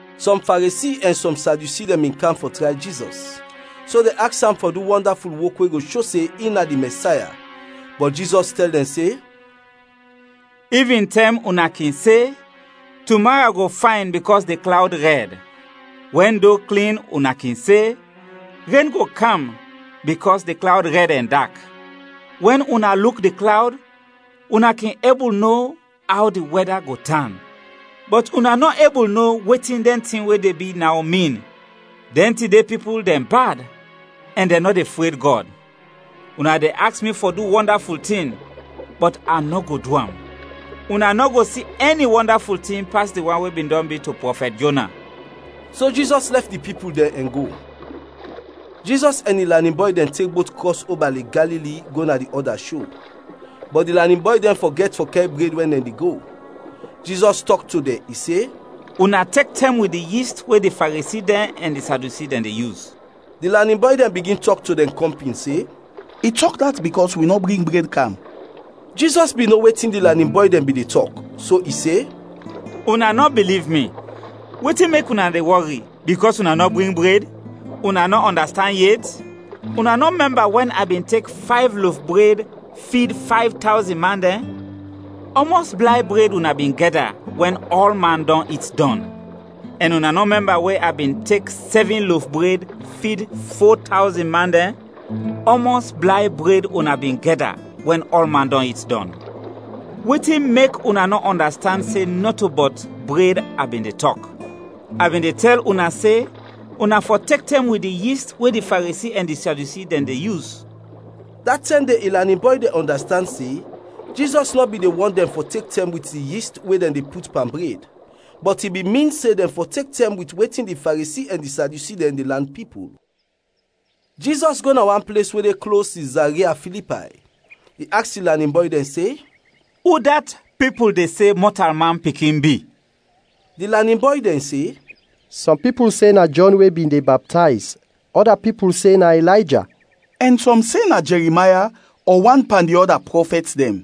Sɔm Faresi ɛn sɔm Sadyusi dɛn bin kam fɔ tray Jizɔs, so dɛn aks am fɔ du wɔndaful wok we go sho se in na di Mɛsaya. Bɔt Jizɔs tɛl dɛn se, “Ivintɛm, una kin se, ‘Tumara go fayn bikɔs di klawd rɛd.’ Wɛn do klin, una kin se, ‘Ren go kam bikɔs di klawd rɛd ɛn dak.’ Wɛn una luk di klawd, una kin ebul no aw di wɛda go tan, bɔt una nɔ ebul no wetin dɛn tin we de bi naw, min. Dɛn tide pipul dɛn bad ɛn dɛn nɔ de fred Gɔd! Una de aks mi fɔ du wɔndaful tin, bɔt a nɔ go du am. Una nɔ go si ɛni wɔndaful tin pas di wan we bin dɔn bi to prɔfɛt Jona.” So Jizɔs lɛf di pipul dɛn ɛn go. Jizɔs ɛn in lanin bɔy dɛn tek bot krɔs oba Lek Galili go na di ɔda sho, bɔt di lanin bɔy dɛn fɔgɛt fɔ kɛr bred wɛn dɛn de go. Jizɔs tɔk to dɛn, i se, “Una tek tɛm wit di yist we di Faresi dɛn ɛn di Sadyusi dɛn de yus.” Di lanin bɔy dɛn bigin tɔk to dɛn kɔmpin se, “I tɔk dat bikɔs wi nɔ bring bred kam.” Jizɔs bin no wetin di lanin bɔy dɛn bin de tɔk, so i se, “Una nɔ biliv mi! Wetin mek una de wɔri bikɔs una nɔ bring bred? Una nɔ ɔndastand yet? Una nɔ mɛmba wɛn a bin tek fayv lof bred fid fayv tawzin man dɛn? Ɔmɔs blay bred una bin gɛda wɛn ɔlman dɔn it dɔn? Ɛn una nɔ mɛmba we a bin tek sɛvin lof bred fid fo tawzin man dɛn? Ɔmɔs blay bred una bin gɛda wɛn ɔlman dɔn it dɔn? Wetin mek una nɔ ɔndastand se nɔto bɔt bred a bin de tɔk? A bin de tɛl una se, una fɔ tek tɛm wit di yist we di Faresi ɛn di Sadyusi dɛn de yus.” Da tɛm de in lanin bɔy dɛn ɔndastand se, Jizɔs nɔ bin de wɔn dɛn fɔ tek tɛm wit di yist we dɛn de put pan bred, bɔt i bin min se dɛn fɔ tek tɛm wit wetin di Faresi ɛn di Sadyusi dɛn de lan pipul. Jizɔs go na wan ples we de klos Sizaria Filipay, i aks in lanin bɔy dɛn se, “Udat pipul de se Mɔtalman Pikin bi?” Di lanin bɔy dɛn se, “Sɔm pipul se na Jɔn we bin de baptayz, ɔda pipul se na Ilayja, ɛn sɔm se na Jɛrimaya ɔ wan pan di ɔda prɔfɛt dɛn.”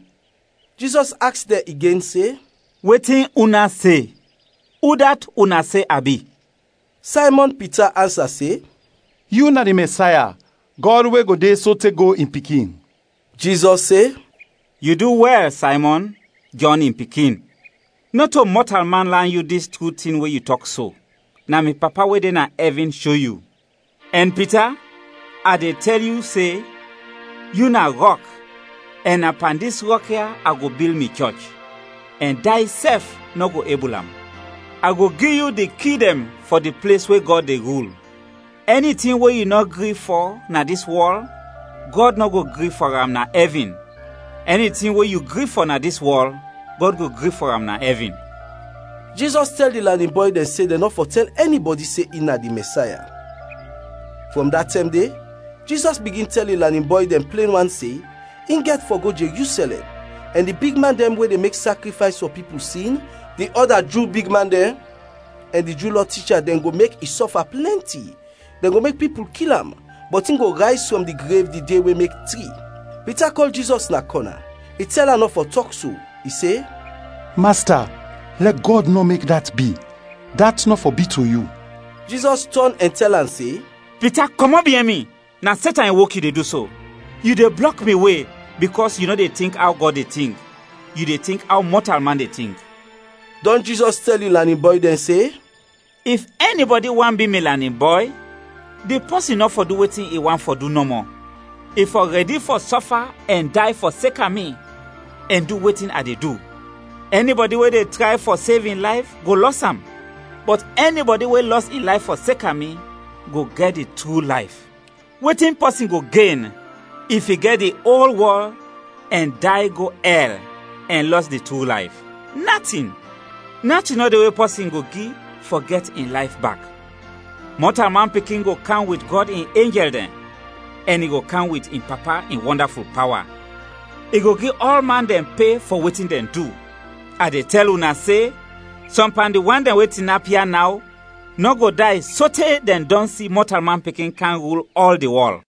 Jizɔs aks dɛn igen se, “Wetin una se? Udat una se a bi?” Saymɔn Pita ansa se, “Yu na di Mɛsaya, Gɔd we go de sote go, in Pikin!” Jizɔs se, “Yu du wɛl, Saymɔn, Jɔn in pikin. Nɔto mɔtalman lan yu dis tru tin we yu tɔk so, na mi Papa we de na ɛvin sho yu. Ɛn Pita, a de tɛl yu se: yu na rɔk, ɛn na pan dis rɔk ya a go bil mi chɔch, ɛn day sɛf nɔ go ebul am. A go gi yu di ki dɛn fɔ di ples we Gɔd de rul. Ɛni tin we yu nɔ gri fɔ na dis wɔl, Gɔd nɔ go gri fɔ am na ɛvin; ɛni tin we yu gri fɔ na dis wɔl, Gɔd go gri fɔ am na ɛvin.” Jizɔs tɛl di lanin bɔy dɛn se dɛn nɔ fɔ tɛl ɛnibɔdi se in na di Mɛsaya. Frɔm dat tɛm de, Jizɔs bigin tɛl in lanin bɔy dɛn plen wan se, in gɛt fɔ go Jerusɛlɛm, ɛn di bigman dɛn we de mek sakrifays fɔ pipul sin, di ɔda Ju bigman dɛn, ɛn di Ju Lɔ ticha dɛn go mek i sɔfa plɛnti. Dɛn go mek pipul kil am, bɔt in go rayz frɔm di grev di de we mek tri. Pita kɔl Jizɔs na kɔna, i tɛl am nɔ fɔ tɔk so, i se, “Masta, lɛ Gɔd nɔ mek dat bi. Dat nɔ fɔ bi to yu!” Jizɔs tɔn ɛn tɛl am se, “Pita, kɔmɔt biɛn mi, na Setan in wok yu de du so. Yu de blɔk mi we, bikɔs yu nɔ de tink aw Gɔd de tink, yu de tink aw mɔtalman de tink.” Dɔn Jizɔs tɛl in lanin bɔy dɛn se, “If ɛnibɔdi want bi mi lanin bɔy, di pɔsin nɔ fɔ du wetin i want fɔ du nɔmɔ, i fɔ rɛdi fɔ sɔfa ɛn day fɔseka mi, ɛn du wetin a de du. Ɛnibɔdi we de tray fɔ sev in layf go lɔs am; bɔt ɛnibɔdi we lɔs in layf fɔseka mi, go gɛt di tru layf. Wetin pɔsin go gen if i gɛt di ol wɔl, ɛn day go ɛl ɛn lɔs di tru layf? Natin! Natin nɔ de we pɔsin go gi fɔ gɛt in layf bak. Mɔtalman Pikin go kam wit Gɔd in enjɛl dɛn ɛn i go kam wit in Papa in wɔndaful pawa; i go gi ɔlman dɛn pe fɔ wetin dɛn du. A de tɛl una se, sɔm pan di wan dɛn we tinap ya naw nɔ go day sote dɛn dɔn si Mɔtalman Pikin kam rul ɔl di wɔl.”